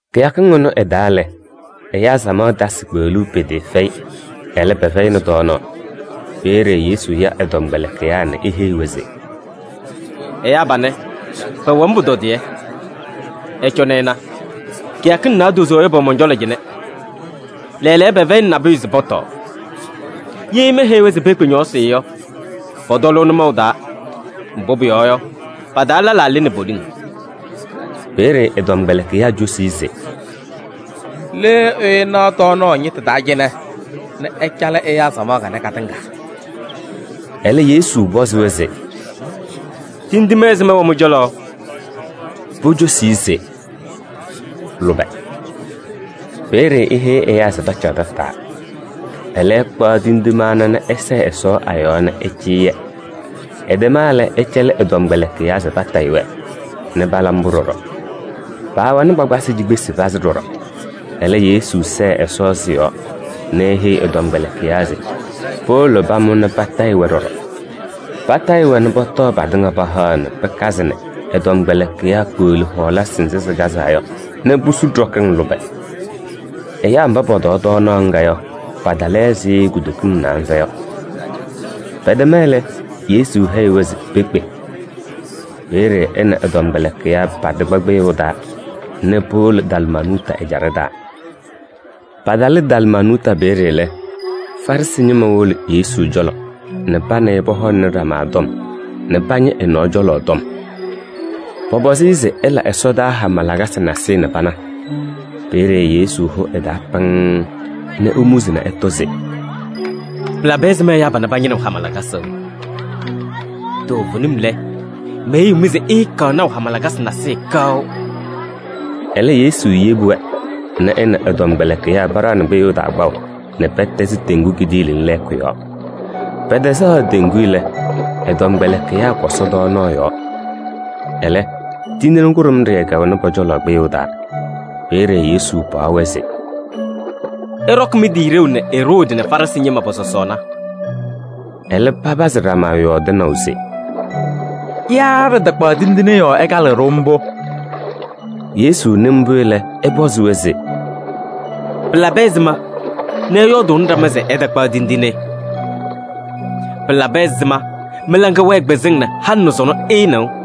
Kɩyakɩŋ ɩnʋ ɩ-taa lɛ, ɛyaa samaɣ tasɩ kpeɣluu pɩtɩɩfɛyɩ, ɛlɛ pɛfɛyɩnɩ tɔɔnaɣ. Peeye Yesu ya ɛ-tɔmkpɛlɩkɩyaa nɛ eheyi-wɛ se: “Ɛyaa panɛ, pɛwɛ-m pʋtɔdɩyɛ. Ɩcɔnɩ ɩna, kɩyakɩŋ naadozo yɔ pɛwɛ mɔn-cɔlɔ cɩnɛ. Lɛɛlɛɛyɔ pɛfɛyɩnɩ nabʋyʋ se pɔtɔɔ. Ye meheyi-wɛ se pekpe ñɔɔsɩ yɔ, pɔtɔlʋʋ nʋmɔʋ taa. Mbʋ pʋyɔɔ yɔ, pa-taa lɛlaa lɩnɩ poliŋ.” Peeye ɛ-tɔmkpɛlɩkɩyaa cosi-i se: “Le ɛyʋ naɣ tɔɔnaɣ ñɩtʋ taa cɩnɛ nɛ ɛcalɩ ɛyaa samaɣ kanɛ katɩŋa?” Ɛlɛ Yesu pɔzɩ-wɛ se: “Tindine ɛzɩma wɛ mɩ-cɔlɔ?” Pocosi-i se: “Lʋbɛ.” Peeye eheyi ɛyaa se pacaɣ tataa. Ɛlɛ, ɛkpaɣ tindine ana nɛ ɛsɛɛ Ɛsɔ a-yɔɔ nɛ ɛcɩyɩ-yɛ. Ɛtɛma lɛ, ɛcɛlɩ ɛ-tɔmkpɛlɩkɩyaa se patayɩ-wɛ, nɛ pala mbʋ ɖɔɖɔ. Paawɛnɩ kpakpasɩ cikpesi pazɩ ɖɔɖɔ. Ɛlɛ, Yesu sɛɛ Ɛsɔ sɩ-yɔɔ nɛ eheyi ɛ-tɔmkpɛlɩkɩyaa se powolo pamʋ nɛ patayɩ-wɛ ɖɔɖɔ. Patayɩ-wɛ nɛ pɔtɔɔ patɩŋa pahaɣ nɛ pɩkazɩ nɛ ɛ-tɔmkpɛlɩkɩyaa kpeɣli hɔɔlasɩ nzɩ sɩkazaa yɔ nɛ pusu ɖɔkɩŋ lʋbɛ. Ɛyaa mba pɔtɔɔ tɔɔnaɣ ŋga yɔ, patalɩ ɛzɩ kutokiŋ naanza yɔ. Pɛtɛma lɛ, Yesu heyi-wɛ se pekpe. Peeye ɛ nɛ ɛ-tɔmkpɛlɩkɩyaa patɩkpa kpɩyʋʋ taa nɛ powolo Dalmanuuta ɛjaɖɛ taa. Patalɩ Dalmanuuta peeye lɛ, Farɩsɩ ñɩma wolo Yesu cɔlɔ nɛ pa nɛ ɩ pɔhɔŋnɩ ɖama tɔm nɛ pañɩ ɛ-nɔɔ cɔlɔ tɔm. Pɔpɔzɩ-ɩ se ɛla ɛsɔdaa hama lakasɩ nasɩyɩ nɛ pana. Peeye Yesu hʋ ɛ-taa pɩŋŋ nɛ emuzi nɛ ɛtɔ se: “Pɩlabɩ ɛzɩma ɛyaa panɛ pañɩnɩɣ Ɛsɔ hama lakasɩ? Toovenim lɛ, meheyiɣ-mɩ se ɩɩkaɣ naʋ hama lakasɩ nasɩyɩ kaʋ.” Ɛlɛ, Yesu yebi-wɛ nɛ ɛ nɛ ɛ-tɔmkpɛlɩkɩyaa paɖaɣnɩ kpɩyʋʋ taa kpaʋ nɛ pɛtɛzɩ teŋgu kidiiliŋ lɛɛkʋ yɔɔ. Pɛtɛzaɣ teŋgu lɛ, ɛ-tɔmkpɛlɩkɩyaa kɔsɔ tɔɔnaɣ yɔɔ. Ɛlɛ, tindine kʋɖʋmɖɩyɛ kɛwɛnɩ pɔ-cɔlɔ kpɩyʋʋ taa. Peeye Yesu paɣ-wɛ se: “Ɩɖɔkɩ mɩ-tɩ ɖeu nɛ Eroodi nɛ Farɩsɩ ñɩma pɔ-sɔsɔɔna.” Ɛlɛ papazɩ ɖama yɔɔdɩnaʋ se: “Yaa ɖɩtakpaɣ tindine yɔɔ ɛkalɩɣ-ɖʋ mbʋ.” Yesu nɩ mbʋ lɛ, ɛpɔzɩ-wɛ se: “Pɩlabɩ ɛzɩma nɛ ɩyɔɔdʋʋnɩ ɖama se ɩtakpaɣ tindine? Pɩlabɩ ɛzɩma mɩ-laŋa wɛɛ kpɩzɩŋ nɛ halɩ nɛ sɔnɔ ɩɩnɩɣ?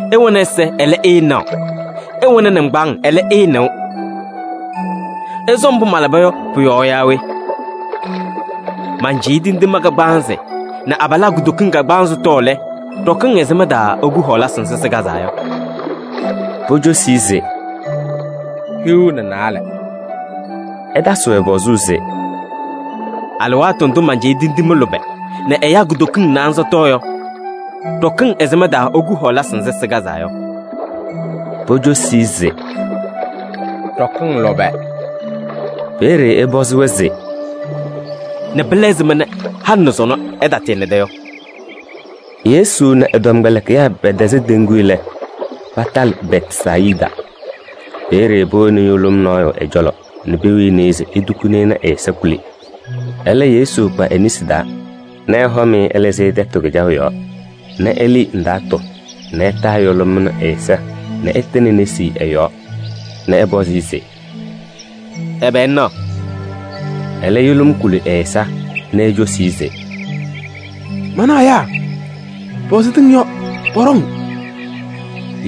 Ɩwɛnɩ ɛza, ɛlɛ ɩɩnaɣ, ɩwɛnɩ nɩŋgbaaŋ, ɛlɛ ɩɩnɩɣ. Ɩsɔ mbʋ malaba yɔ pʋ-yɔɔ yaa we? Mancɩyɩ tindine kagbaanzɩ nɛ abalaa kutokiŋ kagbaanzɩ tɔɔ lɛ, ɖɔkɩŋ ɛzɩma taa iku hɔɔlasɩ nzɩ sɩkazaa yɔ?” Pocosi-i se: “Hiu nɛ naalɛ.” Ɛtasɩ-wɛ pɔzʋʋ se: “Alɩwaatʋ ndʋ mancɩyɩ tindine lʋbɛ nɛ ɛyaa kutokiŋ naanza tɔɔ yɔ, ɖɔkɩŋ ɛzɩma taa iku hɔɔlasɩ nzɩ sɩkazaa yɔ?” Pocosi-i se: “Ɖɔkɩŋ lʋbɛ.” Peeye ɛpɔzɩ-wɛ se: “Nɛ pɩla ɛzɩma halɩ nɛ sɔnɔ ɩtatɩɩnɩda yɔ?” Yesu nɛ ɛ-tɔmkpɛlɩkɩyaa pɛtɛzɩ teŋgu lɛ, patalɩ Bɛtsayɩda. Peeye powoni yʋlʋm nɔɔyʋ ɛ-cɔlɔ nɛ pewini-i se etukuni-i nɛ ɛ-ɛza kuli. Ɛlɛ, Yesu kpa e-nesi taa nɛ ɛhɔm-ɩ ɛlɩzɩ-ɩ tɛtʋ kɩjaʋ yɔɔ nɛ elii ndaatʋ nɛ ɛtaa yʋlʋm ɛnʋ ɛ-ɛza nɛ ɛtɩnɩ e-nesi ɛ-yɔɔ nɛ ɛpɔzɩ-ɩ se: “Ɛbɛ ŋnaɣ?” Ɛlɛ yʋlʋm kuli ɛ-ɛza nɛ ecosi-i se: “Manaɣ ɛyaa, pɛwɛ ɛzɩ tɩŋ yɔ, pɔɖɔŋ.”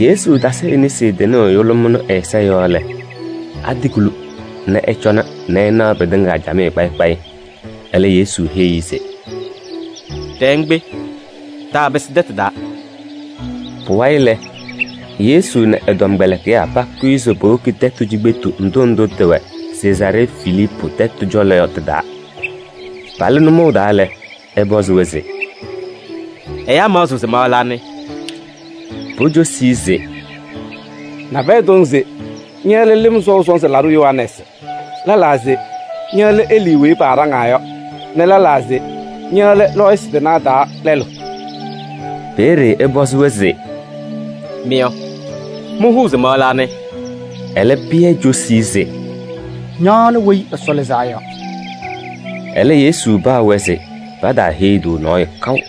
Yesu tasɩ e-nesi tɩnʋʋ yʋlʋm ɛnʋ ɛ-ɛza yɔɔ lɛ, atɩkuli nɛ ɛcɔna nɛ ɛnaɣ pɩtɩŋa camɩyɛ kpayɩ kpayɩ. Ɛlɛ Yesu heyi-i se: “Ɖɛɛ ŋkpe, taapɩsɩ tɛtʋ taa.” Pʋwayɩ lɛ, Yesu nɛ ɛ-tɔmkpɛlɩkɩyaa pakʋyɩ se powoki tɛtʋ cikpetu ndʋ ndʋ tɩwɛ Sezaaree Filiipu tɛtʋ cɔlɔ yɔ tɩ-taa. Palɩ nʋmɔʋ taa lɛ, ɛpɔzɩ-wɛ se: “Ɛyaa maɣzɩɣ se ma lɛ anɩ?” Pocosi-i se: “Nabɛyɛ tɔŋ se ña lɛ Lɩm Sɔʋ Sɔnzɩ Laɖʋ Yohanɛɛsɩ. Lɛlaa se ña lɛ Elii weyi paaɖaŋaa yɔ nɛ lɛlaa se ña lɛ lɔɔyɩsɩ tɩnaa taa lɛlʋ.” Peeye ɛpɔzɩ-wɛ se: “Mɩ yɔ, mɩhʋʋ se ma lɛ anɩ?” Ɛlɛ, Pɩyɛ cosi-i se: “Ña lɛ Weyi Ɛsɔ Lɩzaa Yɔ.” Ɛlɛ, Yesu paɣ-wɛ se pataaheyi-tʋ nɔɔyʋ kaʋ.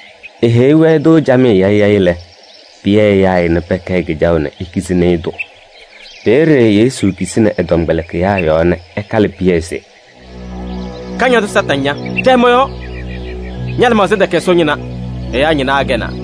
Eheyi-wɛ-tʋ camɩyɛ yayɩ yayɩ lɛ, Pɩyɛ yaa-ɩ nɛ pɛkɛɛ kɩjaʋ nɛ ekizini-i-tʋ. Peeye Yesu kisini ɛ-tɔmkpɛlɩkɩyaa yɔɔ nɛ ɛkalɩ Pɩyɛ se: “Kañadʋ Satanɩ ña! Ɖɛɛ mɔ-yɔɔ. Ña-lɩmaɣza tɛkɛ Ɛsɔ ñɩna, ɛyaa ñɩna akɛnaa.”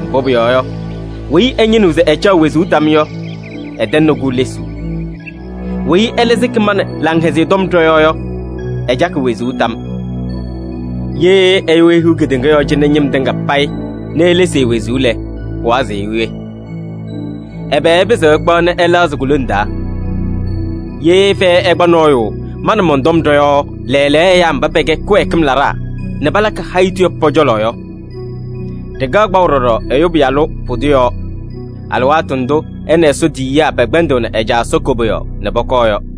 Mbʋ pʋyɔɔ yɔ, weyi ɛñɩnɩɣ se ɛcaɣ wezuu tam yɔ, ɛtɛŋnɩ-kʋ lesuu. Weyi ɛlɛ sɩkɩ ma nɛ Laŋhɛzɩyɛ Tɔm ɖɔ-yɔɔ yɔ, ɛcakɩ wezuu tam. Ye ɛyʋ ehiɣ kedeŋa yɔɔ cɩnɛ ñɩm tɩŋa payɩ nɛ elesi e-wezuu lɛ, pɩwazɩɣ-ɩ we? Ɛbɛ ɛpɩzɩɣ ɛkpaɣ nɛ ɛlɛɣzɩ ku-lone taa? Ye fɛyɛ ɛkpa nɔɔyʋ ma nɛ mɔn-tɔm ɖɔ-yɔɔ lɛɛlɛɛyɔ ɛyaa mba pɛkɛ kɩwɛɛkɩm laɖaa nɛ palakɩ hayitu yɔ pɔ-cɔlɔ yɔ, ɖɩkaɣ kpaʋ ɖɔɖɔ Ɛyʋ Pɩyalʋ pʋdʋ yɔɔ, alɩwaatʋ ndʋ ɛ nɛ Ɛsɔ tiyiyaa pɛkpɛndɩɣnɩ ɛ-Caa Ɛsɔ koboyaɣ nɛ pɔkɔɔ yɔ.”